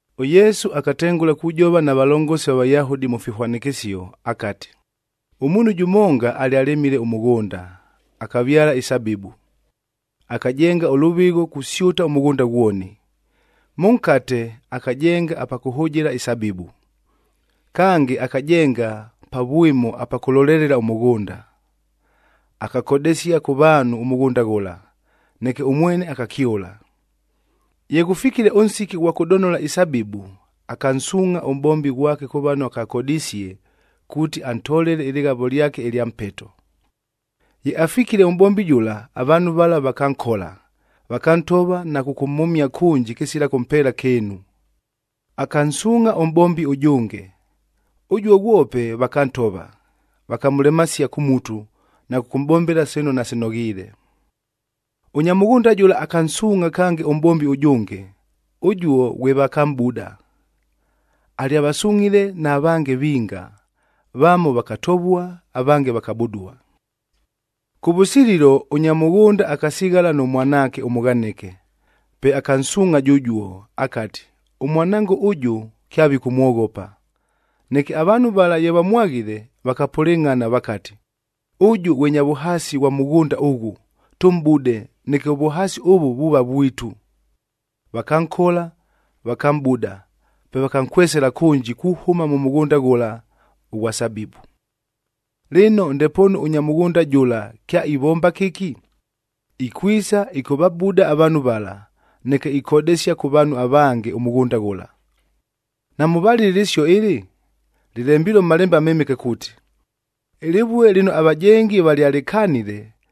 ɄYesu akatengʉla kujova na valongosi va Vayahudi mʉ fihwanɨkɨsio, akati, “Ʉmuunhu jʉmonga alyalɨmile ʉmʉghʉnda, akavyala isabibu. Akajenga ʉlʉvɨgho kusyʉta ʉmʉghʉnda ghwoni. Mʉnkate, akajenga apa kʉhʉjɨla isabibu. Kange, akajenga pa vwɨmo apa kʉlolelelela ʉmʉghʉnda. Akakodesia kʉ vaanhu ʉmʉghʉnda ghʉla, neke ʉmwene akakyʉla. Ye ghʉfikile ʉnsiki ʉghwa kʉdonola isabibu, akansuungʼha ʉmʼbombi ghwake kʉ vano akakodisie, kuuti antolele ɨlɨghavo lyake ɨlya mpeto. Ye afikile ʉmʼbombi jʉla, avaanhu vala vakankola, vakantova na kʉkʉmhʉmia kʉnji kɨsila kʉmpeela kɨɨnu. Akansuungʼha ʉmʼbombi ʉjʉnge, ʉjuo ghwope vakantova, vakamʉlemasia kʉ mutu na kʉkʉmʼbombela sino nasinoghiile. Ʉnya mʉghʉnda jʉla akansuungʼha kange ʉmʼbombi ʉjʉnge, ʉjuo ghwe vakamʼbuda. Alyavasungʼhile na vange vinga, vamo vakatovua, avange vakabudua. “Kʉvʉsililo, ʉnya mʉghʉnda akasighala nʉ mwanaake ʉmʉghanɨke. Pe akansuungʼha jʉjuo, akati, ‘Ʉmwanango ʉjʉ, kyavikʉmwoghopa.’ Neke avaanhu vala ye vamwaghile, vakapʉlɨngʼhana, vakati, ‘Ʉjʉ ghwe nya vʉhaasi ghwa mʉghʉnda ʉghʉ, tʉmʼbude neke ʉvʉhaasi ʉvʉ vuuva vwitu!’ Vakankola, vakamʼbuda, pe vakankwesela kʉnji kuhʉma mʉ mʉghʉnda ghʉla ʉghwa sabibu. “Lɨno, ndepoonu ʉnya mʉghʉnda jʉla kyaivomba kɨki? Ikwisa ɨkʉvabuda avaanhu vala, neke ikodesia kʉ vaanhu avange ʉmʉghʉnda ghʉla. Namʉvalile ɨlɨsio ɨlɨ? Lɨlembilue mʉ Malembe aMɨmɨke kuuti, ‘Ɨlɨvue lɨno avajengi valyalɨkanile,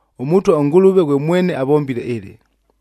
ɄMʉtwa ʉNgʉlʉve ghwe mwene avombile ɨlɨ,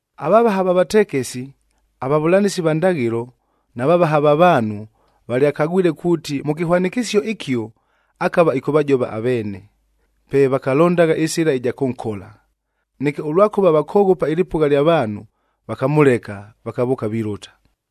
Avavaha va vatekesi, avavʉlanɨsi va ndaghɨlo na vavaha va vaanhu, valyakagwile kuuti, mʉ kɨhwanɨkɨsio ɨkio akava ɨkʉvajova aveene, pe vakalondagha ɨsɨla ɨja kʉnkola. Neke ʉlwakʉva vakoghopa ɨlɨpʉgha lya vaanhu, vakamʉleka, vakavʉʉka vilʉta.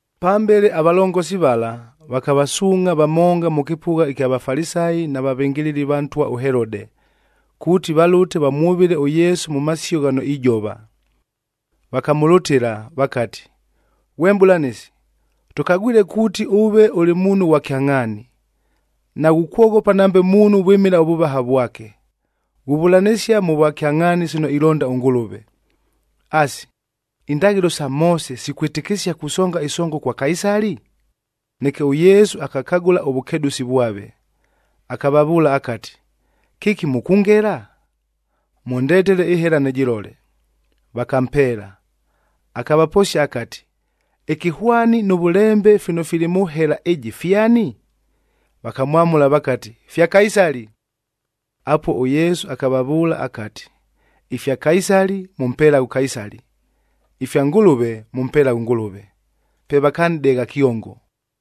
Pambele avalongosi vala, vakavasuungʼha vamonga mʉ kɨpʉgha ɨkya Vafalisayi na vavɨngɨlɨli va ntwa ʉHelode, kuuti valʉte vamwʉvɨle ʉYesu mʉ masio ghano ijova. Vakamʉlʉtɨla, vakati, “Ghwe Mʼbʉlanɨsi, tʉkagwile kuuti ʉve ʉlɨ muunhu ghwa kyangʼhaani, naghukwoghopa nambe muunhu vwɨmɨla ʉvʉvaha vwake. Ghuvʉlanɨsia mʉ vwakyangʼhaani sino ilonda ʉNgʉlʉve. Asi, indaghɨlo sa Moose sikwɨtɨkɨsia kusonga ɨsongo kwa Kaisali?” Neke ʉYesu akakagʉla ʉvʉkedʉsi vwave, akavavʉʉla akati, “Kɨki mʉkʉngela? Mʉndetele ɨhela nɨjɨlole.” Vakampeela. Akavaposia akati, “Ɨkɨhwani nʉ vʉlembe fino fili mʉ hela ɨjɨ fyani?” Vakamwamʉla vakati, Apuo ʉYesu akavavʉʉla akati, “Ifya Kaisali, mʉmpelaghe ʉKaisali; ifya Ngʉlʉve, mʉmpelaghe ʉNgʉlʉve.” Pe vakanʼdegha kyongo.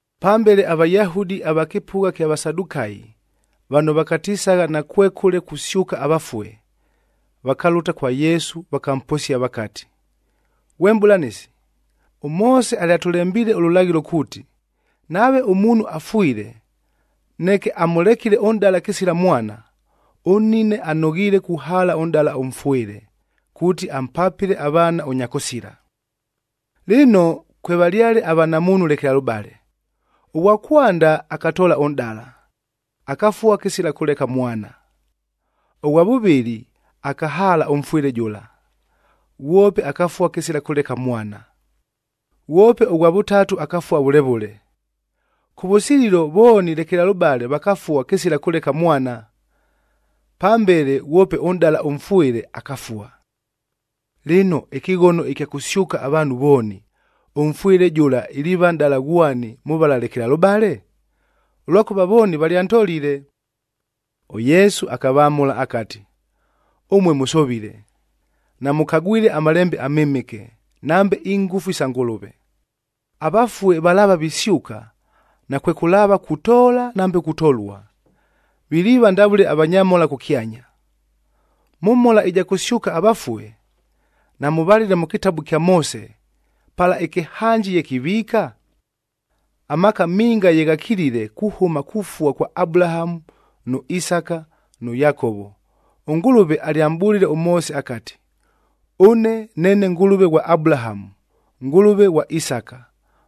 Pambele aVayahudi ava kɨpʉgha kya Vasadukayi,d vano vakatisagha nakwekʉle kusyʉka avafue, vakalʉta kwa Yesu vakamposia vakati, “Ghwe Mʼbʉlanɨsi, ʉMoose alyatʉlembiile ʉlʉlaghɨlo kuuti, nave ʉmuunhu afwile, neke amʉlekile ʉnʼdala kɨsila mwana, ʉnnine anoghiile kuhaala ʉnʼdala ʉmfwɨle kuuti ampapɨle avaana ʉnyakʉsila. Lɨno, kwevalyale avanamuunhu lekelalʉbale. Ʉghwa kwanda akatoola ʉnʼdala, akafua kɨsila kʉleka mwana. Ʉghwa vʉvɨlɨ, akahaala ʉmfwɨle jʉla, ghwope akafua kɨsila kʉleka mwana. Ghwope ʉghwa vʉtatu, akafua vʉle vʉle. Kʉvʉsililo vooni lekelalʉbale vakafua kɨsila kʉleka mwana. Pambele ghwope ʉnʼdala ʉmfwɨle, akafua. Lɨno, ɨkɨghono ɨkya kʉsyʉka avaanhu vooni, ʉmfwɨle jʉla iliiva nʼdala ghwani mʉ vala lekelalʉbale? Ʉlwakʉva vooni valyantolile.” ɄYesu akavamʉla akati, “Ʉmue mʉsovile, namʉkagwile aMalembe aMɨmɨke, nambe ingʉfu sa Ngʉlʉve. Avafue valaava visyʉka, nakwekʉlaava kutoola nambe kutolua, viliiva ndavʉle avanyamhola kʉkyanya. Mʉ mhola ɨja kʉsyʉka avafue, namʉvalile mʉ kɨtabu ɨkya Moose, pala ɨkɨhanji ye kiviika? Amaaka minga ye ghakilile kuhʉma kufua kwa Abulahamu nʉ Isaka nʉ Yakovo, ʉNgʉlʉve alyamʼbʉlile ʉMoose akati, ‘Ʉne neene Ngʉlʉve ghwa Abulahamu, Ngʉlʉve ghwa Isaka,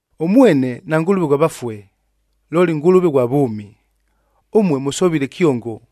Ʉmwene naNgʉlʉve ghwa vafue, looli Ngʉlʉve ghwa vʉʉmi. Ʉmue mʉsovile kyongo.”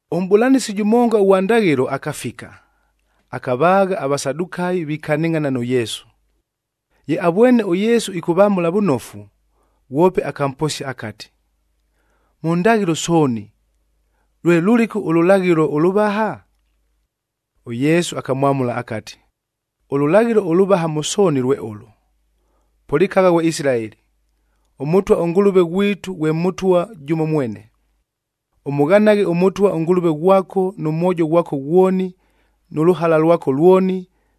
Ʉmʼbʉlanɨsi jʉmonga ʉghwa ndaghɨlo akafika, akavaagha aVasadukayi vikanɨngʼhana nʉ Yesu. Ye avwene ʉYesu ɨkʉvamʉla vʉnofu, ghwope akamposia akati, “Mʉ ndaghɨlo sooni, lwe lʉlɨku ʉlʉlaghɨlo ʉlʉvaha?” ɄYesu akamwamʉla akati, “Ʉlʉlaghɨlo ʉlʉvaha mʉ sooni lwe ʉlʉ, ‘Pʉlɨkagha ghwe Isilaeli, ʉMʉtwa ʉNgʉlʉve ghwitu ghwe Mʉtwa jʉmo mwene. Ʉmʉghanaghe ʉMʉtwa ʉNgʉlʉve ghwako nʉ mwojo ghwako ghwoni, nʉ lʉhala lwako lwoni,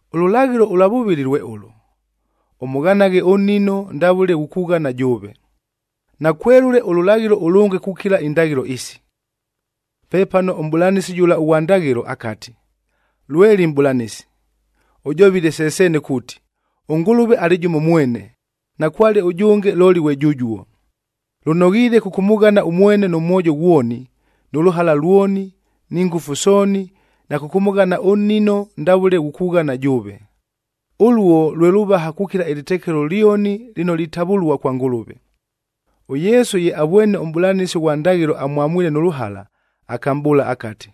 Ʉlʉlaghɨlo ʉlwa vʉvɨlɨ lwe ʉlʉ, ‘Ʉmʉghanaghe ʉnnino ndavʉle ghukughana jʉʉve.’h Nakwelʉle ʉlʉlaghɨlo ʉlʉnge kukila indaghɨlo isi.” Pepano ʉmʼbʉlanɨsi jʉla ʉghwa ndaghɨlo akati, “Lweli Mʼbʉlanɨsi! Ʉjovile se seene kuuti, ʉNgʉlʉve alɨ jʉmo mwene, nakwale ʉjʉnge looli ghwe jʉjuo. Lʉnoghiile kʉkʉmʉghana ʉmwene nʉ mwojo ghwoni, nʉ lʉhala lwoni, ni ngʉfu sooni na kʉkʉmʉghana ʉnnino ndavʉle ghukughana jʉʉve. Ʉluo lwe lʉvaha kukila ɨlɨtekelo lyoni lɨno litavʉlua kwa Ngʉlʉve.” ɄYesu ye avwene ʉmʼbʉlanɨsi ʉghwa ndaghɨlo amwamwile nʉ lʉhala, akamʼbʉʉla akati,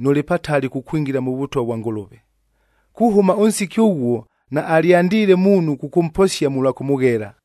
“Nʉlɨ patali kukwingila mʉ Vʉtwa vwa Ngʉlʉve.” Kuhʉma ʉnsiki ʉghuo, naalyandiile muunhu kʉkʉmposia mʉlwa kʉmʉghela.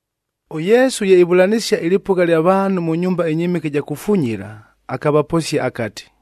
ɄYesu ye ivʉlanɨsia ɨlɨpʉgha lya vaanhu mʉ nyumba ɨnyɨmɨke ɨja kufunyila, akavaposia akati,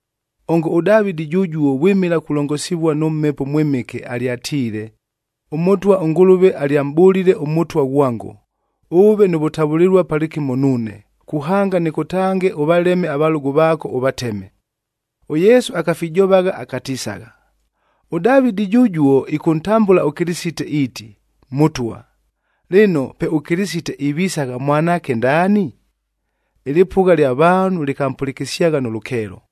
Ongo ʉDavɨdi jʉjuo vwɨmɨla kulongosivua nʉ Mhepo ʉMwɨmɨke, alyatiile, ‘ɄMʉtwa ʉNgʉlʉve alyamʼbʉlile ʉMʉtwa ghwango, “Ʉʉve nʉ vʉtavʉlɨlua palɨkɨmo nuune, kuhanga nɨkʉtange ʉvaleme avalʉgʉ vaako, ɄYesu akafijovagha akatisagha, “ɄDavɨdi jʉjuo ɨkʉntambʉla ʉKɨlɨsite iiti, ‘Mʉtwa.’ Lɨno, pe ʉKɨlɨsite ivisagha mwanaake ndaani?” Ɨlɨpʉgha lya vaanhu lɨkampʉlɨkɨsyagha nʉ lʉkeelo.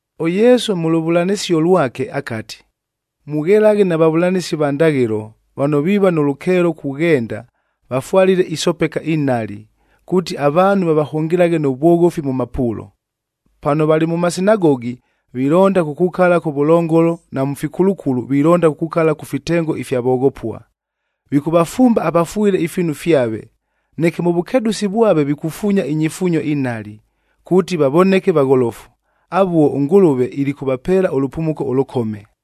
ɄYesu mʉ lʉvʉlanɨsio lwake akati, “Mughelaghe na vavʉlanɨsi va ndaghɨlo vano viiva nʉ lʉkeelo kughenda vafwalile isopeka inhali, kuuti avaanhu vavahʉngɨlaghe nʉ vwoghofi mʉ mapuulo. Pano valɨ mʉ masinagogi, vilonda kukukala kʉvʉlongolo, na mʉ fikulukulu vilonda kukukala kʉ fitengo ifya voghopua. Vikʉvafumba avafwɨle ifiinu fyave, neke mʉ vʉkedʉsi vwave vikufuunya inyifuunyo inhali kuuti vavoneke vagholofu. Avuo, ʉNgʉlʉve ilikʉvapeela ʉlʉpumuko ʉlʉkome.”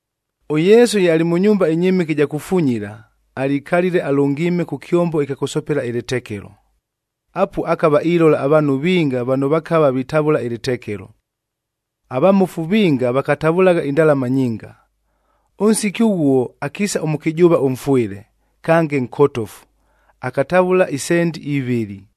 ɄYesu ye alɨ mʉ nyumba ɨnyɨmɨke ɨja kufunyila, alikalile alʉngiime kʉ kyombo ɨkya kʉsopela ɨlɨtekelo. Apuo akava ilola avaanhu vinga vano vakava vitavʉla ɨlɨtekelo. Avamofu vinga vakatavʉlagha indalama nyinga. Ʉnsiki ʉghuo akiisa ʉmʉkɨjʉʉva ʉmfwɨle kange nkotofu, akatavʉla isendi ivɨlɨ.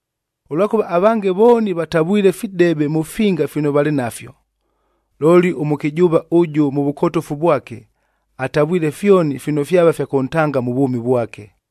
Ʉlwakʉva avange vooni vatavwile fidebe mʉ finga fino valɨ nafyo. Looli ʉmʉkɨjʉʉva ʉjʉ mʉ vʉkotofu vwake, atavwile fyoni fino fyava fya kʉntanga mʉ vwʉmi vwake.”